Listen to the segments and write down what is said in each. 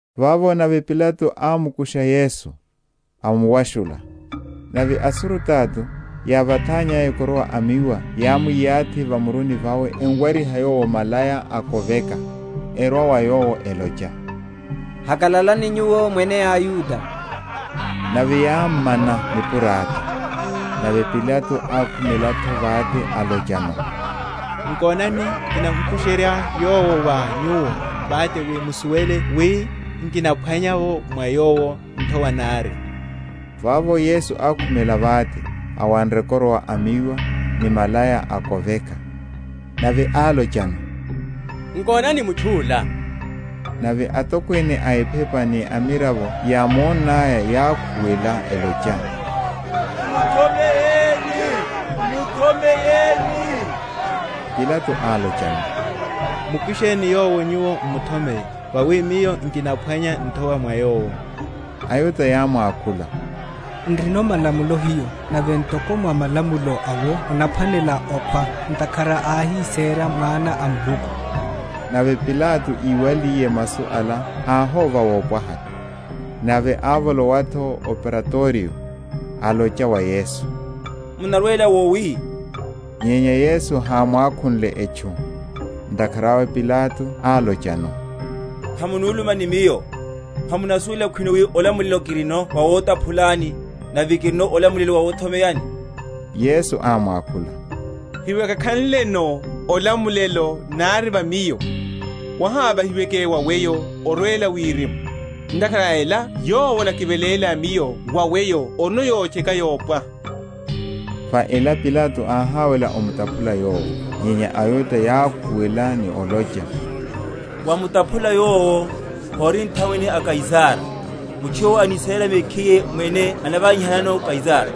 Vavo nave Pilato ámukusha Yesu, amuwashula. Nave asurutato, yávathannyaya koroa a miwa yámwi?-?yathi va muruni vawe emuwariha Yowo malaya a koveka; erwa wa Yowo, elocha, Hakalalani Nyuwo Mwene a aYuda! nave yámmana nipurata. Nave Pilato ákhumela’tho vate, alochano, Nkonani, kimukusherye Yowo wa nyuwo vate wi musuwele wi nkinaphwanya mwa Yowo nthowa nari. Vavo Yesu ákhumela vate, awanre koroa a miwa, ni malaya a koveka. Nave álochano, Nkonani mutchu’la! Nave atokwene a ephepa ni amiravo yámonnaya, yákhuwela elocha, Muthomeye, muthomeye. Pilato álochano, Mukusheni Yowo nyuwo m’muthomeye: vawi miyo nkinaphwanya nthowa mwa Yowo. AYuda yámwakhula, N’rino malamulo hiyo, nave ntoko mwa malamulo awo anaphwanela okhwa, ntakhara áhisera Mwana a Muluku. Nave Pilato íwaliye masu ala, áhóva wopwaha. Nave ávolowa’tho o Praitorio, alocha wa Yesu, Munarwela wowi? nyenya Yesu hámwakhunle etchu. Ntakhara awe Pilato álochano, Hamunuluma ni miyo? hamunasuwela khwino wi olamulelo kirino wawotaphulani, nave kirino olamulelo wawothomeyani? Yesu ámwakhula, Hewákakhanleno olamulelo nari va Miyo, wahávahiweke wa weyo orwela wirimu; ntakhara a ela yowo anakiveléla Miyo wa weyo orino yotcheka yopwaha. Va ela Pilato áháwela omutaphula Yowo; nyenya aYuda yákhuwela, ni olocha, Wamutaphula Yowo, hori nthamwene a Kaisara: mutchu yowo anisera mekhiye mwene anavanyihanano Kaisara.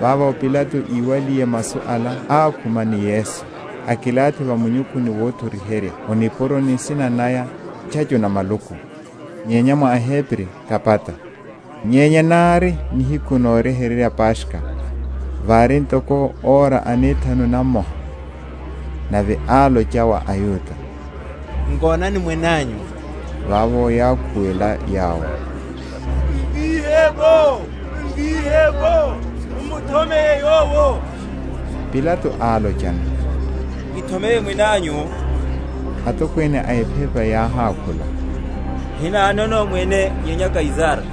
Vavo Pilato íwaliye masu ala ákhuma ni Yesu, akilathi va munyukhuni wothoriherya o nipuroni nsina naya, Ntchacho na maluku, nyenya mwa eHebri, Gabata. Nyenya nári nihiku noryeherya Paskha: vári ntoko ora anethanu namoha. Nave álocha wa aYuda, Nkonani, Mwene anyu! Vavo yákhuwela yawo, Mvíhe’vo, mvíhe’vo, muthomeye Yowo! Pilato álochano, Kithomeye Mwene anyu? Atokwene a ephepa yáhákhula, Hinanono Mwene nyenya Kaisara.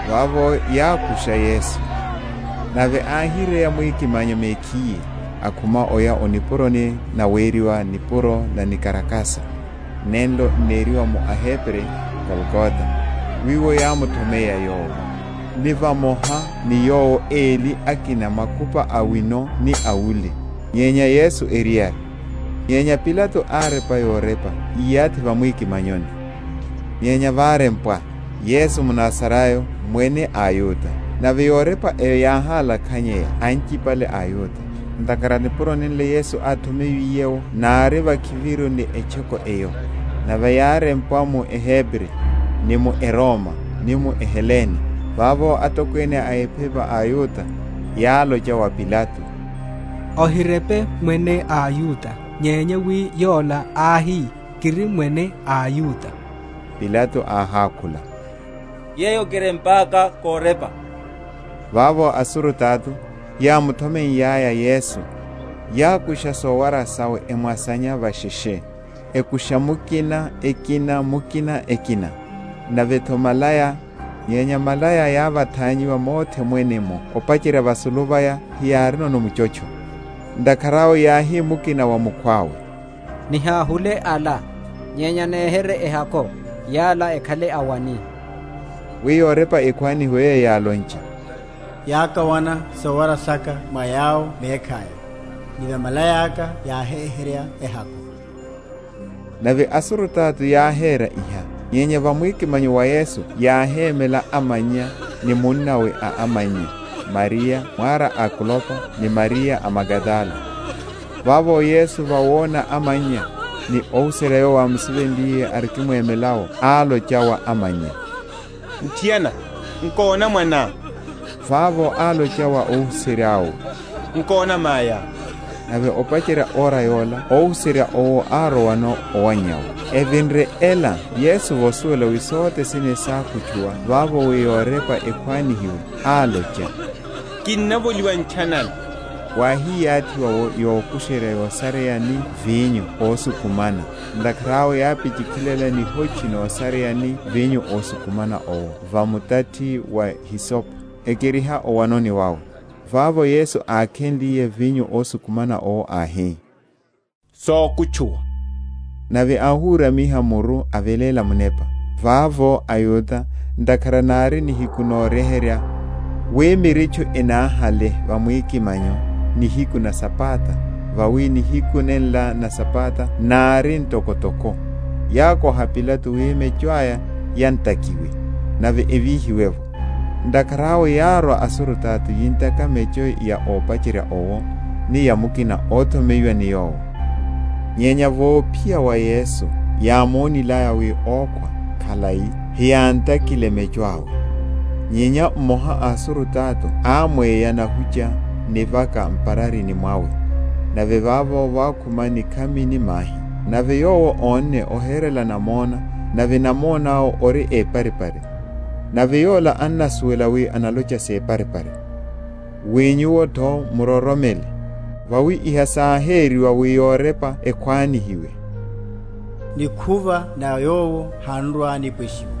Vavo yákusha Yesu: nave áhireya mwikimanyo mekhiye, akhuma oya o nipuroni naweriwa Nipuro na nikarakasa, nenlo n’neriwa mu eHebri, Golgota: wiwo yámuthomeya Yowo; ni vamoha ni Yowo eli akina, makupa awino ni awule, nyenya Yesu eriyari. Nyenya Pilato árepa yorepa, íyathi va mwikimanyoni. Nyenya várempwa, YESU MNAZARAYO, MWENE A AYUDA. Nave yorepa eyo yáhálakhanya anchipale a aYuda; ntakhara nipuro nenlo Yesu áthomeyiwiye’wo nári vakhiviru ni etchoko eyo; nave yárempwa mu Ehebri, ni mu eRoma, ni mu eHelene. Vavo atokwene a ephepa a aYuda, yálocha wa Pilato, Ohirepe, Mwene a aYuda; nyenya, wi yola áhi, Kiri Mwene a aYuda. Pilato áhákhula, Yeyo kirempaka korepa. Vavo asurutato, yámuthomeiyaya Yesu, yákusha sowara sawe, emwasanya vasheshe, akusha mukina ekina mukina ekina, nave’tho malaya; nyenya malaya yávathanyiwa mothe mwene’mmo opacherya vasulu vaya, heyárino muchotcho. Ntakhara awe yáhi mukina wa mukhwawe, Nihahule ala, nyenya nehere?-?rye ehako, yala ekhale a wani; wi yorepa ekhwanihiwe yeyo yálonche, Yákawana sowara saka mwa yawo mekhaya, ni va malaya’ka yáhehererya ehako. Nave asurutato yáhera iha. Nyenya va mwikimanyo wa Yesu yáhémela amannya, ni munnawe a amannya, Mariya, mwara a Klopa, ni Mariya a Magadala. Vavo Yesu vawona amannya, ni óhuserya yowo ámusivenliye, arikimwemela’wo, álocha wa amannya, Muthiana, nkona, mwaná! Vavo álocha wa óhuserya owo, Nkona, amayá. Nave opacherya ora yola óhuserya owo árowano owannyawe. Evinre ela Yesu, vosuwela wi sothe sene sákutchuwa vavo wi yorepa ekhwanihiwe, álocha, Kinnavoliwa ntchanana. Wáhiyathiwa’wo yokusherya yosareya ni vinyo ósukumana; ntakhara awe yápichi?-?khilela nihoche nosareya ni vinyo ósukumana owo va mutathi wa hisope, ekeriha o’wanoni wawe. Vavo Yesu ákhenliye vinyo ósukumana owo áhi, Sokutchuwa; nave áhuramiha muru, aveléla munepa. Vavo aYuda, ntakhara nári nihiku noryeherya, wi mirutchu enáhale va mwikimanyo nihiku na Sabata, vawi nihiku nenla na Sabata nári ntokotoko, yákoha Pilato wi mecho aya yantakiwe, nave evíhiwe’vo. Ntakhara awe yárwa asurutato yintaka mecho ya ópacherya owo, ni ya mukina owo óthomeyiwa ni Yowo; nyenya vophiya wa Yesu, yámonilaya, wi ókhwa khalai, hiyántakile mecho awe: nyenya mmoha a asurutato ámweya nahucha n’nivaka m’pararini mwawe, nave vavo vákhuma nikhami ni mahi. Nave yowo ónne, oherela namona, nave namona awe ori éparipari; nave yola annasuwela wi analocha séparipari, wi nyuwo’tho muroromele. Vawi iha sáheriwa, wi yorepa ekhwanihiwe, Nikhuva na Yowo han’rwa‐nipweshiwa.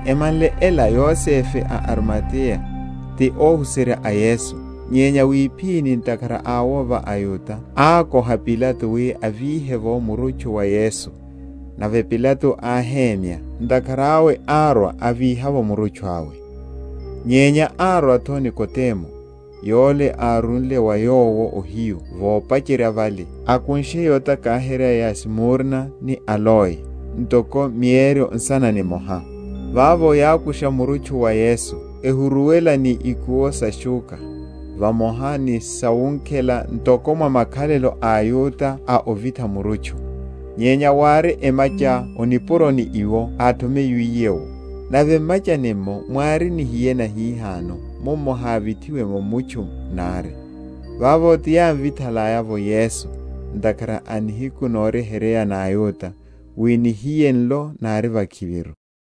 Emanle ela Yosefe a o Arimateya, ti óhuserya a Yesu, nyenya wiphini ntakhara a wova aYuda, ákoha Pilato wi avíhe’vo murutchu wa Yesu. Nave Pilato áhemya. Ntakhara awe árwa, avíha’vo murutchu awe. Nyenya árwa’tho Nikodemu, yole árúle wa Yowo ohiyu vopacherya vale, akunshe yotakaherya ya smurna ni aloe, ntoko mieryo nsana nimoha. Vavo yákusha murutchu wa Yesu, ehuruwela ni ikuwo sa shúkha vamoha ni sawunkhela, ntoko mwa makhalelo a aYuda a ovitha murutchu. Nyenya wári emacha o nipuroni wiwo áthomeyiwiye’wo, nave m’machani’mmo mwári nihiye nahihano mummo hávithiwe’mo mutchu nari. Vavo ti yámvithalaya’vo Yesu, ntakhara a nihiku noryeherya na aYuda, wi nihiye nlo nári vakhiviru.